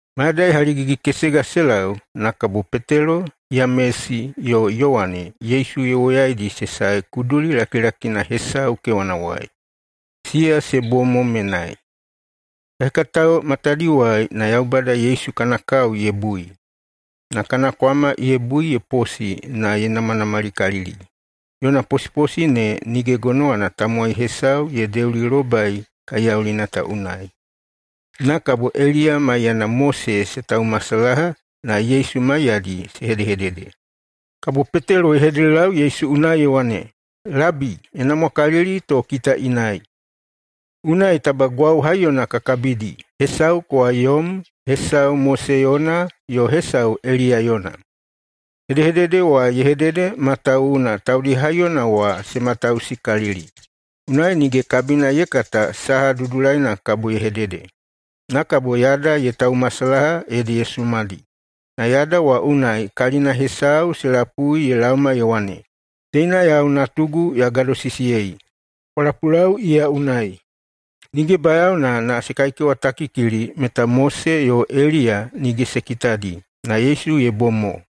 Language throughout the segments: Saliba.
Mayadai haligigi-kesega se lau, na kabo Petelo, Yamesi, yo Yowane Yesu ye woyaidi se sae kuduli lakilakina hesau kewanawai. Siya se bom mo menai. Hekahekatao matadiwai na Yaubada Yesu kana kao ye bui. Na kana kwama ye bui ye posi na ye namanamalikalili, yona posiposi ne nige gonowana tamowai hesau ye deulilobai kaiyaulina ta unai. Na kabo Eliya maiyana Mose se taumasalaha na Yesu maiyadi se hedehedede. Kabo Petelo ye hededelau Yesu unai ye wane, “Labi, ye namwakalili to kita inai. Unai taba gwau haiyona ka kabidi, hesau kowa yom, hesau Mose yona, yo hesau Eliya yona.” Hedehedede wa ye hedede matawuwuna taudi haiyona wa se matausikalili, unai nige kabina ye kata saha dudulaina kabo ye hedede. Na kabo yada ye taumasalaha ede ye sumadi. Na yada wa unai kalina hesau se lapui ye laoma ye wane, “Teina yau Natugu ya gadosisiyei. Kwa lapulau iya unai!” Nige bayaona na se kaikewatakikili meta Mose yo Eliya nige se kitadi, na Yesu ye bom mo.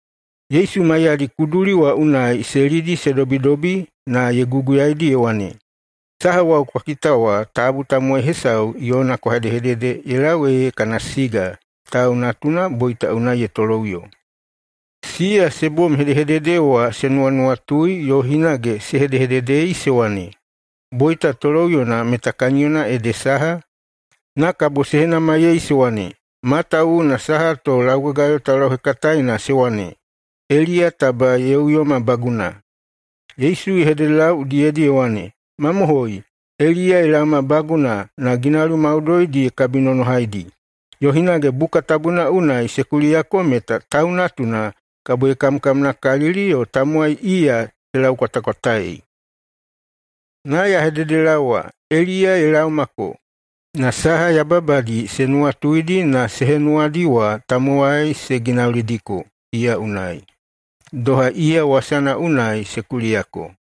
Yesu maiyadi kuduli wa unai se lidi se dobidobi na ye guguyaidi ye wane, “Saha wau kwa kita wa tabu tamowai hesau yona kwa hedehedede ye lau ee kana siga Tau Natuna boita unai ye toloꞌuyo.” Siya se bom hedehedede wa se nuwanuwatui yo hinage se hedehededei se wane, “Boita toloꞌuyona meta kaniyona ede saha?” Na kabo se henamaiyei se wane, “Matawuwuna saha to laugagayo taulauhekataena se wane, Eliya taba ye uyomabaguna?” Yesu ye hededelau udiyedi ye wane, “Mamohoi, Eliya ye laomabaguna na ginauli maudoidi ye kabinonohaidi. Yo hinage Buka Tabuna unai se kuliyako meta Tau Natuna kabo ye kamkamnakalili yo tamowai iya se laukwatakwataei. Na ya hededelaowa, Eliya ye laomako, na saha yababadi se nuwatuidi na se henuwadi wa tamowai se ginaulidiko iya unai, doha iya wasana unai se kuliyako.”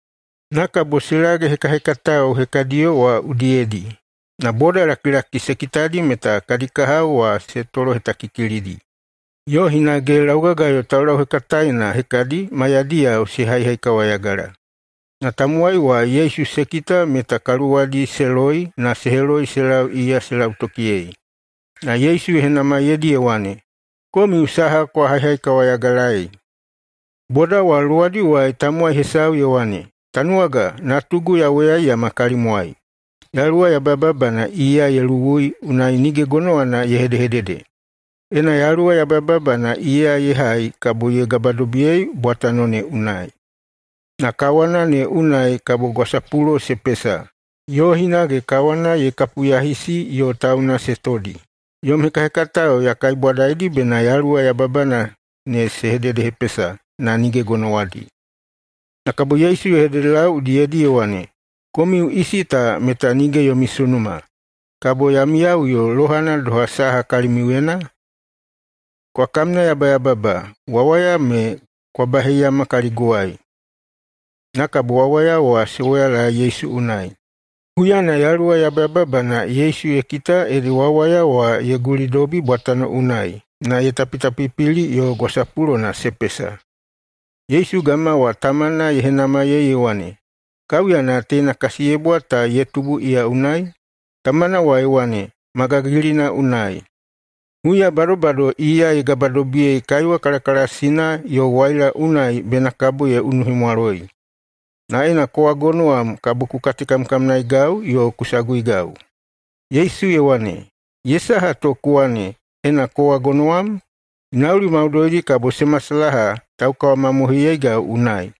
Na kabo se lage hekahekatao hekadiyo wa udiyedi. Na bodalakilaki se kitadi meta kadi kahao wa se tolohetakikilidi, yo hinage laugagayo taulauhekataena hekadi maiyadiyao se haihaikawayagala. Na tamowai wa Yesu se kita meta kaluwadi se loi na se heloi se lau iya se lautokiyei. Na Yesu ye henamaiyeidi ye wane, “Komiu saha kwa haihaikawayagalaei?” Boda wa luwadiwai tamowai hesau ye wane, “Tanuwaga, natugu ya woyaiyama kalimwai. Yaluwa yabayababana iya ye luwui, unai nige gonowana ye hedehedede. Ena yaluwa yabayababana iya ye hai, kabo ye gabadobiyei bwatano ne unai, na kawana ne unai kabo gwasapulo se pesa, yo hinage kawana ye kapuyahisi yo tauna se todi. Yom hekahekatao ya kaibwadaidi bena yaluwa yababana ne se hededehepesa, na nige gonowadi.” Na kabo Yesu ye hededelau udiyedi ye wane, “Komiu isi ta meta nige yomi sunuma! Kabo ya miyaꞌuyo lohana doha saha kalimiuyena? Kwa kamnayabayababa! Wawaya me kwa baheiyama kaliguwai.” Na kabo wawaya wa se woyalae Yesu unai. Huyana yaluwa yabayababana Yesu ye kita ede wawaya wa ye gulidobi bwatano unai na ye tapitapipili yo gwasapulona se pesa. Yesu gama wa tamana ye henamaiyei ye wane, “Kaiuyana teina kasiyebwa ta ye tubu iya unai?” Tamana wa ye wane, “Ma gagilina unai. Huya se bado iya ye gabadobiyei kaiwa kalakalasina yo waila unai bena kabo ye unuhemwaloi. Na ena kowa gonowam, kabo ku katekamkamnaegai yo ku saguigai.” Yesu ye wane, “Ye saha to ku wane, ‘Ena kowa gonowam’? Ginauli maudoidi kabo se masalaha taukawamamohoiyeigau unai.”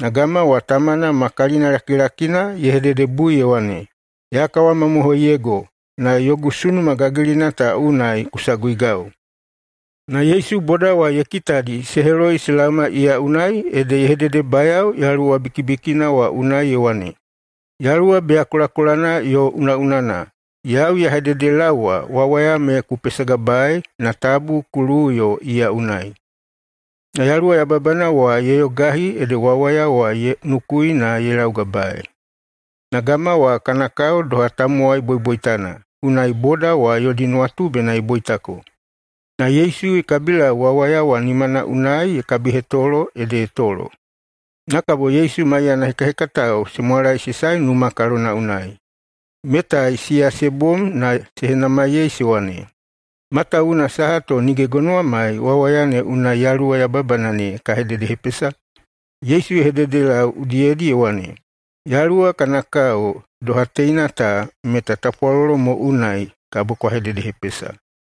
Na gama wa tamana ma kalinalakilakina ye hededebui ye wane, “Ya kawamamohoiyego! Na yogu sunuma gagilina ta unai ku saguigau.” Na Yesu boda wa ye kitadi se heloi se laoma iya unai, ede ye hededebayao yaluwa bikibikina wa unai ye wane, “Yaluwa beyakolakolana yo unaꞌunana, yau ya hededelaowa, wawaya me ku pesagabae na tabu ku luwuꞌuyo iya unai.” Na yaluwa yababana wa ye yogahi ede wawaya wa ye nukui na ye laugabaei. Na gama wa kana kao doha tamowai boiboitana, unai boda wa yodi nuwatu bena ye boitako. Na Yesu ye kabilau wawaya wa nimana unai ye kabihetolo, ede ye tolo. Na kabo Yesu maiyana hekahekatao se mwalaesae numa kalona unai. Metai siya se bom na se henamaiyei se wane, “Matawuwuna saha to nige gonowamai wawaya ne unai yaluwa yababana ne ka hededehepesa?” Yesu ye hededelau udiyedi ye wane, “Yaluwa kana kao doha teina ta, meta tapwalolo mo unai kabo kwa hededehepesa.”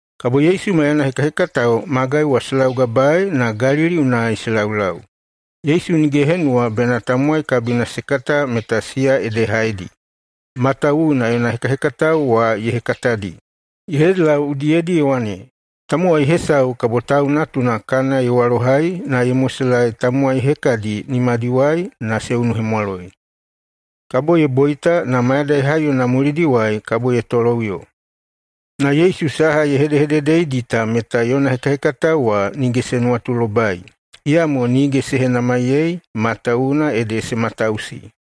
Kabo Yesu maiyana hekahekatao magai wa se laugabae na Galili unai se laulau. Yesu nige ye henuwa bena tamowai kabina se kata meta siya ede haedi, matawuwuna yona hekahekatao wa ye hekatadi. Ye hededelau udiyedi ye wane, “Tamowai hesau kabo Tau Natuna kana ye walohai na ye moselaei tamowai hekadi nimadiwai na se unuhemwaloi. Kabo ye boita, na mayadai haiyona mulidiwai kabo ye toloꞌuyo.” Na Yesu saha ye hedehededeidi ta meta yona hekahekatao wa nige se nuwatulobai. Iyamo nige se henamaiyei, matawuwuna ede se matausi.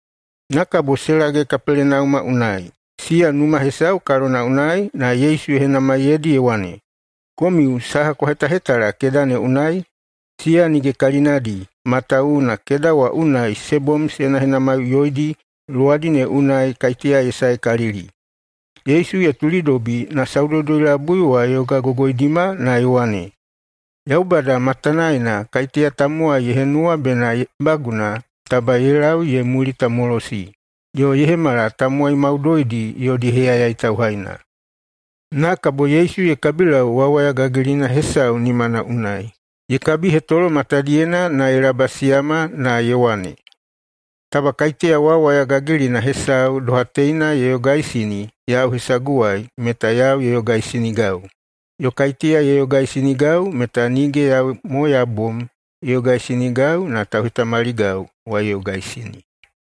Na kabo se lage Kapelenauma unai. Siya numa hesau kalona unai, na Yesu ye henamaiyeidi ye wane, “Komiu saha kwa hetahetala keda ne unai?” Siya nige kalinadi, matawuwuna keda wa unai se bom se henahenamaiꞌuyoidi luwadi ne unai kaiteya ye saekalili. Yesu ye tulidobi na Saudoudoi-labui wa ye yogagogoidima na ye wane, “Yaubada matanaena kaiteya tamowai ye henuwa bena ye baguna, taba ye lau ye mulitamolosi, yo ye hemala tamowai maudoidi yodi heyayai tauhaina.” Na kabo Yesu ye kabilau wawaya gagilina hesau [nimana] unai. Ye kabihetolo matadiyena na ye labasiyama na ye wane, “Taba kaiteya wawaya gagilina hesau doha teina ye yogaisini yau hesaguwai, meta yau ye yogaisinigau. Yo kaiteya ye yogaisinigau meta nige yau mo ya bom ye yogaisinigau, na tauhetamaligau wa ye yogaisini.”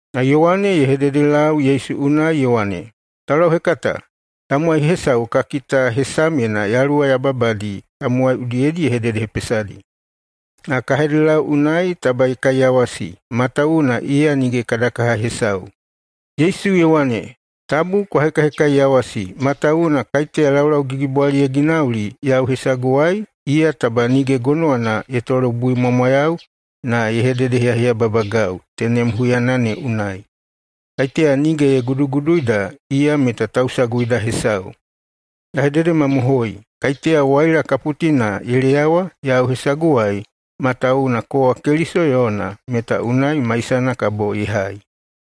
Na Yowane ye hededelau Yesu unai ye wane, “Taulauhekata, tamowai hesau ka kita hesamyena yaluwa yababadi tamowai udiyedi ye hededehepesadi. Na ka hededelau unai taba ye kaiyawasi, matawuwuna iya nige kada kaha hesau.” Yesu ye wane, “Tabu kwa hekahekaiyawasi, matawuwuna kaiteya laulaugigibwali ye ginauli yau hesaguwai, iya taba nige gonowana ye tolobuimwamwayau na ye hededeheyaheyababagau tenem huyana ne unai. Kaiteya nige ye guduguduida, iya meta tausaguida hesau. Ya hededemamohoi: Kaiteya waila kaputina ye leyawa yau hesaguwai matawuwuna kowa Keliso yona, meta unai maisana kabo ye hai.”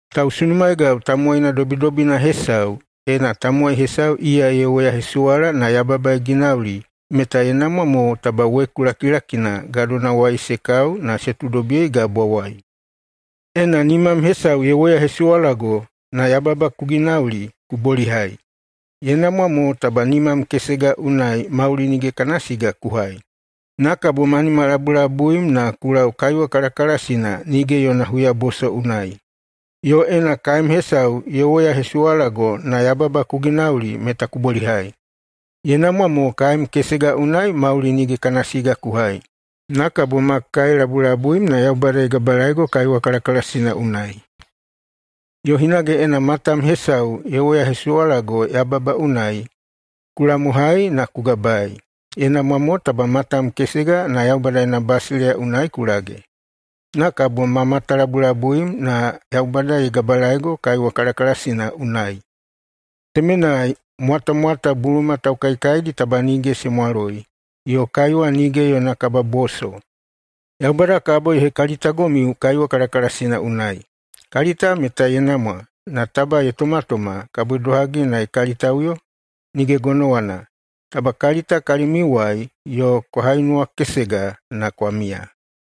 “Tausunumaegau tamowaina dobidobina hesau, ena tamowai hesau iya ye woyahesuwala na yababa ye ginauli, meta ye namwa mo taba weku lakilakina gadonawai se kau na se tuudobiyei gabwawai. Ena nimam hesau ye woyahesuwalago na yababa ku ginauli, ku bolihai. Ye namwa mo taba nimam kesega unai mauli nige kana siga ku hai, na kabo ma nimalabulabuim na ku lau kaiwa kalakalasina nige yona huyaboso unai. Yo ena kaem hesau ye woyahesuwalago na yababa ku ginauli, meta ku bolihai. Ye namwa mo kaem kesega unai mauli nige kana siga ku hai, na kabo ma kaelabulabuim na Yaubada ye gabalaego kaiwa kalakalasina unai. Yo hinage ena matam hesau ye woyahesuwalago yababa unai, ku lamohai na ku gabaei. Ye namwa mo taba matam kesega na Yaubada yona basileiya unai ku lage, na kabo ma matalabulabuim na Yaubada ye gabalaego kaiwa kalakalasina unai, ‘temenai mwatamwata buluma taukaikaidi taba nige se mwaloi, yo kaiwa nige yona kababoso.’ Yaubada kabo ye hekalitagomiu kaiwa kalakalasina unai. Kalita meta ye namwa, na taba ye tomatoma, kabo idohagi na ye kalitaꞌuyo? [Nige gonowana!] Taba kalita kalimiuwai yo kwa hainuwakesega na kwa miya.”